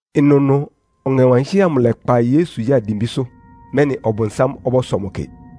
Ɩnʋnʋ Ɔŋɛ Wankɩ́hɛ́ amʋ lɛ́kpa Yesu ya dimbísʋ́, mɛ́nɩ Ɔbʋnsám ɔbɔ́sɔ mʋ kɩ.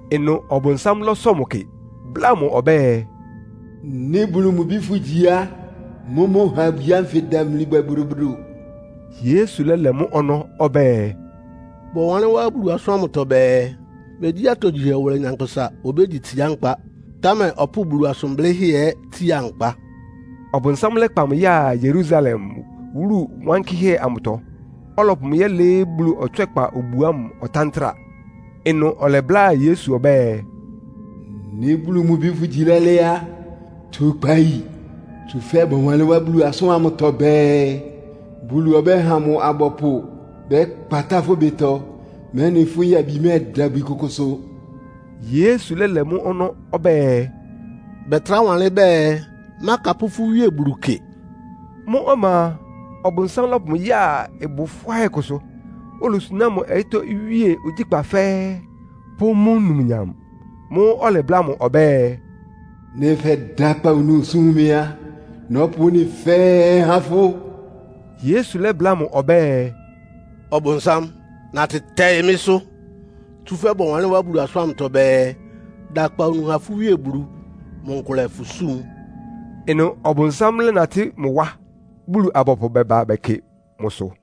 Ɩnʋ Ɔbʋnsám lɔ́sɔ mʋ kɩ, bláa mʋ ɔbɛ́ɛ, “Nɩ́ Bulu mʋ Bi fʋ́gyi á, mʋ́mʋ́ ha abwi ánfɩ ɩdamli bwɛ bodobodo.” Yesu lɛ́lɛ mʋ́ ɔnɔ́ ɔbɛ́ɛ, “Bɔwanlɩ́n wá Bulu asʋ́n ámʋtɔ bɛɛ, ‘Megyí atogyihɛ wʋlɛ nyankpʋsa obégyi tsiá nkpa, támɛ ɔpʋ́ʋ Bulu asʋn blɩ́hɛ́ ɛ́ tsia nkpa.’” Ɔbʋnsám lɛ́kpa mʋ ya Yerusalem, wúlu wankɩ́hɛ́ amʋtɔ, ɔlɔpʋ mʋ yɛ́lɩɩ́ Bulu ɔtswɛ́kpa obu ámʋ ɔtántra. Ɩnʋ ɔlɛbláa Yesu ɔbɛ́ɛ, “Nɩ́ Bulu mʋ Bi fʋ́gyi lɛ́lɛ́ á, tu kpayi. Tsúfɛ́ bɔwanlɩ́n wá Bulu asʋ́n ámʋtɔ bɛɛ, ‘Bulu ɔbɛ́ha mʋ abɔpʋ bɛ́kpatá fʋ́ ɩbɩtɔ, mɛ́nɩ fʋ́ yabi mɛ́ɛda ibwi kʋkʋsʋ.’” Yesu lɛ́lɛ mʋ́ ɔnɔ́ ɔbɛ́ɛ, “Bɛtrá wanlɩ́n bɛɛ, ‘Mákapʋ́ fʋ́ Wíe Bulu kɩ.’” Mʋ́ ɔma a, Ɔbʋnsám lɔ́pʋ mʋ ya ɩbʋ fʋ́áhɛ́ kʋsʋ, olosuná mʋ ɔyɩ́tɔ́ iwíe ogyíkpá fɛ́ɛ́, pʋ́ mʋ́ numnyam. Mʋ́ʋ́ ɔlɛbláa mʋ ɔbɛ́ɛ, “Nɩ́ fɛ́da akpawunu súm mɩ́ á, nɔ́pʋ ɩ́nɩ fɛ́ɛ́ há fʋ́.” Yesu lɛ́bláa mʋ ɔbɛ́ɛ, “Ɔbʋnsám, natɩ tɛɩ mɩ́sʋ́! Tsúfɛ́ bɔwanlɩ́n wá Bulu asʋ́n ámʋtɔ bɛɛ, ‘Da akpawunu ha fʋ́ Wíe Bulu. Mʋ nkʋlɛ fʋ súm.’” Ɩnʋ Ɔbʋnsám lɛ́natɩ́ mʋ wá, Bulu-abɔpʋ bɛba bɛkɩ mʋsʋ.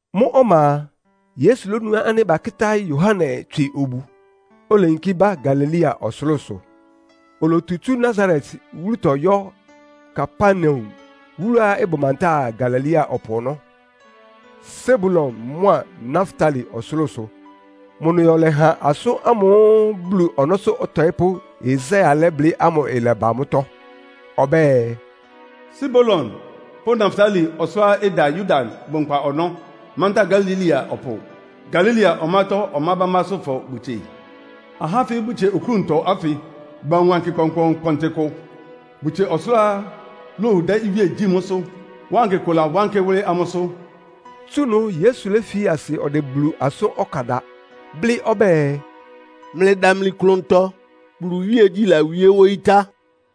Mʋ́ ɔma a, Yesu lónu ánɩ́ bakɩ́tá Yohane tswɩ obu, oleyinkí ba Galilea ɔsʋlʋ́sʋ. Olotu tsú Nasaret wúlutɔ yɔ́ Kapernaum, wúluá ɩbʋ mantáa Galilea ɔpʋ ɔnɔ́, Sebulon mʋ́a Naftali ɔsʋlʋ́sʋ. Mʋ ɩnʋ yɔ lɛ́ha asʋ́n ámʋ́ʋ́ Bulu ɔnɔ́sʋ́ ɔtɔɩ́pʋ́Yesaia lɛ́blɩ́ ámʋ ɩlɛba mʋ́tɔ́. Ɔbɛ́ɛ, “Sebulon pʋ́ Naftali ɔsʋlʋ́ʋá ɩda Yordan bʋnkpa ɔnɔ́, mantáa Galilea ɔpʋ. Galilea ɔmátɔ́ ɔmá bámbásʋ́fɔ bʋtsie. Ahá ánfɩ́ bʋtsie oklúntɔ ánfɩ bawun wankɩ kpɔnkpɔɔnkpɔntɩ kʋ. Bʋtsie ɔsʋlʋ́ʋá lowu dɛ́ iwíe gyí mʋ́sʋ́. Wankɩ kʋ lawánkɩ́ wʋ́lɩ́ amʋ́sʋ́.” Tsú ɩnʋ Yesu léfi asɩ ɔdɛ Bulu asʋ́n ɔkan da, blɩ́ ɔbɛ́ɛ, “Mlɩdamli klʋntɔ, Bulu iwíegyí lawíé wóyí tá.”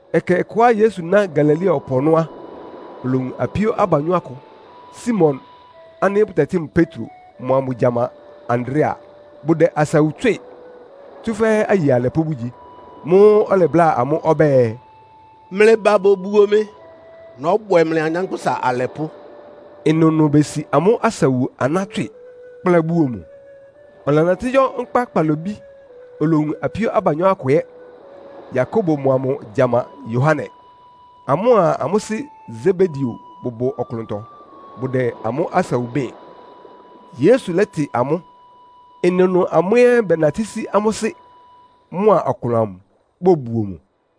Ɛkɛ ɔkʋá Yesu ná Galilea ɔpʋ ɔnɔ́ á, olowun apíó abanyɔ́ akʋ. Simon ánɩ́ bʋtɛtɩ́ mʋ Petro mʋa mʋ gyama Andrea, bʋdɛ asawu tswɩ́ɩ, tsúfɛ́ aye alɛpʋ́ bʋgyi. Mʋ́ʋ́ ɔlɛbláa amʋ́ ɔbɛ́ɛ, “Mlɩba bobuo mɩ. Nɔ́bwɛ mlɩ anyánkpʋ́sa alɛpʋ́.” Ɩnʋnʋ besi amʋ́ asawu aná tswɩ, kplá buo mʋ. Ɔlɛnatɩ́ yɔ́ nkpá kpalobí, olowun apíó abanyɔ́ akʋ ɛ́, Yakobo mʋa mʋ gyama Yohane. Amʋ́a amʋ́ sɩ́ Sebedeo bʋbʋ ɔklʋntɔ, bʋdɛ amʋ́ asawu bɩ́ɩn, Yesu lɛ́tɩ amʋ́. Ɩnʋnʋ amʋ́ ɛ́ bɛnatɩ́ sí amʋ́ sɩ́ mʋa ɔklʋn amʋ bobuo mʋ.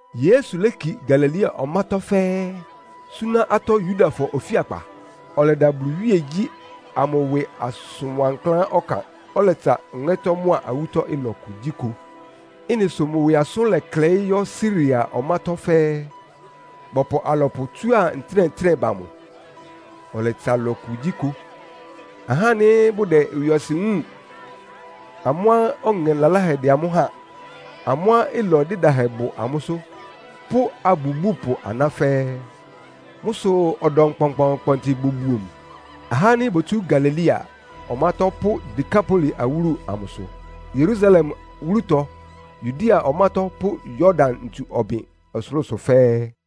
Yesu léki Galilea ɔmátɔ́ fɛ́ɛ́, súná atɔ́ Yudafɔ ofíakpa. Ɔlɛda Bulu iwíegyí ámʋ ɩwɩ asʋn wankláán ɔkan. Ɔlɛtsa ɔŋɛ́tɔ́ mʋ́a awútɔ́ ɩlɔ kugyíkʋ. Ɩ́nɩ sʋ mʋ ɩwɩ asʋ́n lɛklɛɩ́ yɔ́ Siria ɔmátɔ́ fɛ́ɛ́. Bɔpʋ alɔpʋ tsúa ntɩ́nɛ́-ntɩ́nɛ́ ba mʋ. Ɔlɛtsa ɩlɔ kugyíkʋ, ahá ánɩ́ bʋdɛ ɩwɩɔsɩn wúun, amʋ́á ɔŋɛ laláhɛ dɛ́ amʋ́ háan, amʋ́á ɩlɔ dɩ́dahɛ bʋ amʋ́sʋ́ pʋ́ abubúpʋ aná fɛ́ɛ́. Mʋ́ sʋ ɔdɔm kpɔnkpɔɔnkpɔntɩ bobuo mʋ. Ahá ánɩ́ botsú Galilea ɔmátɔ́ pʋ́ Dekapoli awúlu amʋsʋ, Yerusalem wúlutɔ, Yudea ɔmátɔ́ pʋ́ Yordan ntsu ɔbɩn ɔsʋlʋ́sʋ fɛ́ɛ́.